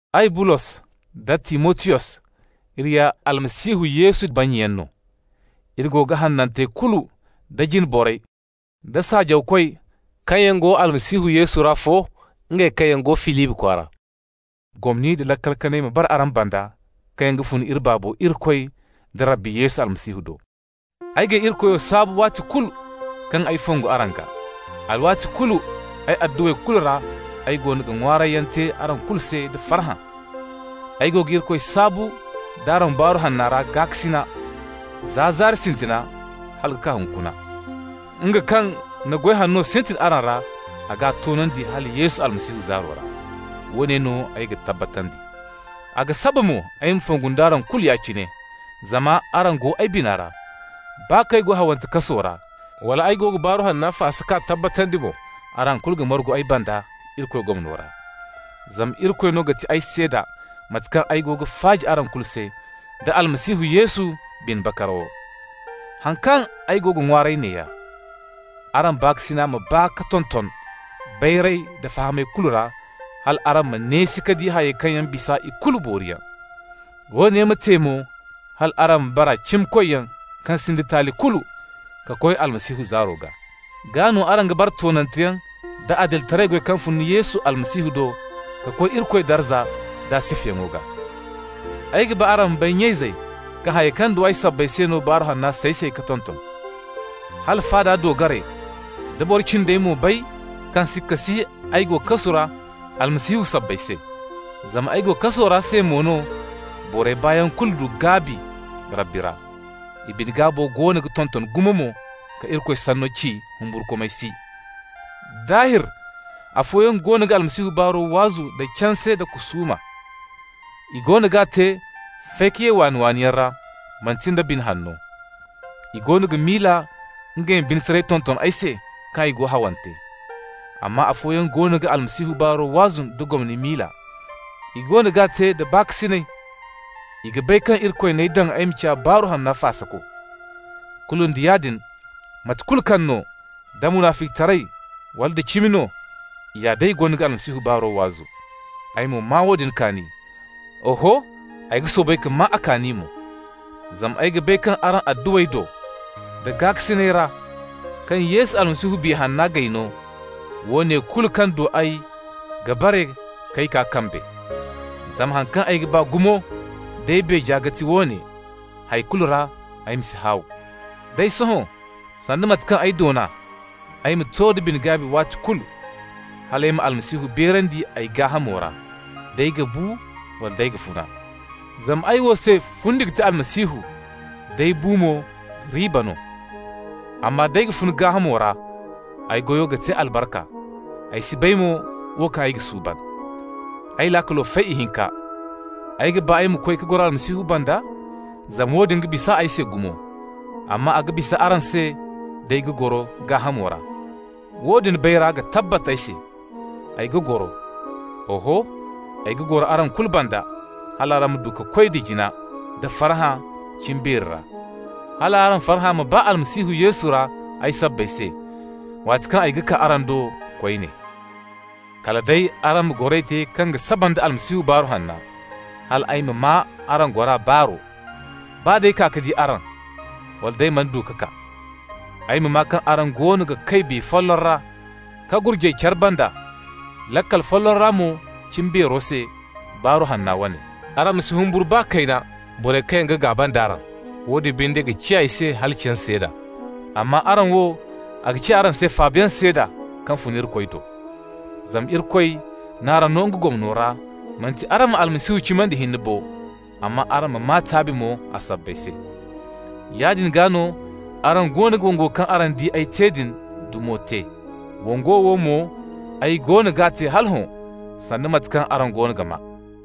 Ay, Bulos, da Timotiyos, iri ya Almasihu Yesu bannyayaŋ no. Iri go ga hanantey kulu da jine borey, da saajawkoy kaŋ yaŋ go Almasihu Yesu ra fo, ngey kaŋ yaŋ go Filibi kwaara. Gomni nda laakal kanay ma bara araŋ banda kaŋ yaŋ ga fun iri Baabo Irikoy da Rabbi Yesu Almasihu do. Ay g'ay Irikoyo saabu waati kulu kaŋ ay ga fongu araŋ gaa. Alwaati kulu ay adduwey kulu ra ay goono ga ŋwaarayyaŋ te araŋ kulu se da farhã. Ay go ga Irikoy saabu d'araŋ Baaru Hanna ra gaakasina, za zaari sintina hala ka kaa hunkuna. Nga kaŋ na goy hanno sintin araŋ ra, a g'a toonandi hala Yesu Almasihu zaaro ra. Woone no ay ga tabbatandi. A ga saba mo ay ma fongu nd'araŋ kulu ya-cine, zama araŋ go ay bina ra. Baa kaŋ ay go hawante kaso ra, wala ay go ga Baaru Hanna faasa k'a tabbatandi mo, araŋ kulu ga margu ay banda Irikoy gomno ra. Zama Irikoy no ga ti ay seeda mate kaŋ ay go ga faaji araŋ kulu se, da Almasihu Yesu bine bakarawo. Haŋ kaŋ ay go ga ŋwaaray neeya: araŋ baakasina ma baa ka tonton bayray da fahamay kulu ra hal araŋ ma neesi ka di hayey kaŋ yaŋ ga bisa ikulu booriyaŋ. Woone ma te mo hal araŋ ma bara cimikoyyaŋ kaŋ sinda taali kulu, ka koy Almasihu zaaro gaa. Gaa no araŋ ga bara toonanteyaŋ da adilitaray goy kaŋ fun Yesu Almasihu do ka koy Irikoy darza d'a sifayaŋo gaa. Ay ga ba araŋ ma bay, nya-izey, kaŋ hayey kaŋ du ay sabbay se no, Baaru Hanna say-say ka tonton. Hala faada doogarey da boro cindey mo bay kaŋ sikka si ay go kasu ra Almasihu sabbay se. Zama ay go kaso ra se mo no, borey baayaŋo kulu du gaabi Rabbi ra. I bine-gaabo goono ga tonton gumo mo ka Irikoy sanno ci humburkumay si. Daahir, afooyaŋ goono ga Almasihu baaro waazu nda canse nda kusuuma. I goono g'a te fay-ka-ye-waani-waaniyaŋ ra, manti nda bine hanno. I goono ga miila ngey ma bine saray tonton ay se kaŋ ay go hawante. Amma afooyaŋ goono ga Almasihu baaro waazu nda gomni miila. I goono g'a te da baakasinay. I ga bay kaŋ Irikoy n'ay daŋ ay ma ciya Baaru Hanna faasako. Kulu nda yaadin, mate kulu kaŋ no, da munaficitaray wala nda cimi no, i ya day goono ga Almasihu baaro waazu. Ay mo maa woodin kaani. Oho, ay ga soobay ka maa a kaani mo. Zama ay ga bay kaŋ araŋ adduwey do, da gaakasinay ra kaŋ Yesu Almasihu Biya Hanna g'ay no, woone kulu kaŋ du ay ga bare k'ay kaa kambe. Zama haŋ kaŋ ay ga ba gumo d'ay beeja ga ti woone: hay kulu ra ay ma si haaw. Day sohõ, sanda mate kaŋ ay doona, ay ma to da bine-gaabi waati kulu, hal ay ma Almasihu beerandi ay gaahamo ra, d'ay ga bu wala d'ay ga funa. Zama ay wo se fundi ga ti Almasihu, d'ay bu mo riiba no. Amma d'ay ga funa gaahamo ra, ay goyo ga te albarka, ay si bay mo wo kaŋ ay ga suuban. Ay laakalo fay ihinka, ay ga ba ay ma koy ka goro Almasihu banda, zama woodin ga bisa ay se gumo. Amma a ga bisa araŋ se d'ay ga goro gaahamo ra. Woodin bayray ga tabbat ay se: ay ga goro. Oho, ay ga goro araŋ kulu banda hal araŋ ma du ka koy jina nda farhã cimbeeri ra, hal araŋ farhã ma baa Almasihu Yesu ra ay sabbay se, waati kaŋ ay ga kaa araŋ do koyne. Kala day araŋ ma goray te kaŋ ga saba nda Almasihu Baaru Hanna, hal ay ma maa araŋ gora baaro, baa d'ay kaa ka di araŋ, wala d'ay mana du ka kaa. Ay ma maa kaŋ araŋ goono ga kay biya folloŋ ra ka gurjay care banda laakal folloŋ ra mo cimbeero se, Baaru Hanna wane. Araŋ ma si humburu baa kayna borey kaŋ yaŋ ga gaaba nd'araŋ. Woodin binde ga ciya i se halaciyaŋ seeda. Amma araŋ wo, a ga ciya araŋ se faabayaŋ seeda kaŋ fun Irikoy do. Zama Irikoy n'araŋ no nga gomno ra, manti araŋ ma Almasihu cimandi hinne bo, amma araŋ ma maa taabi mo a sabbay se. Yaadin gaa no araŋ goono ga wongo kaŋ araŋ di ay te din dumo te. Wongo wo mo ay goono g'a te hala hõ, sanda mate kaŋ araŋ goono ga maa.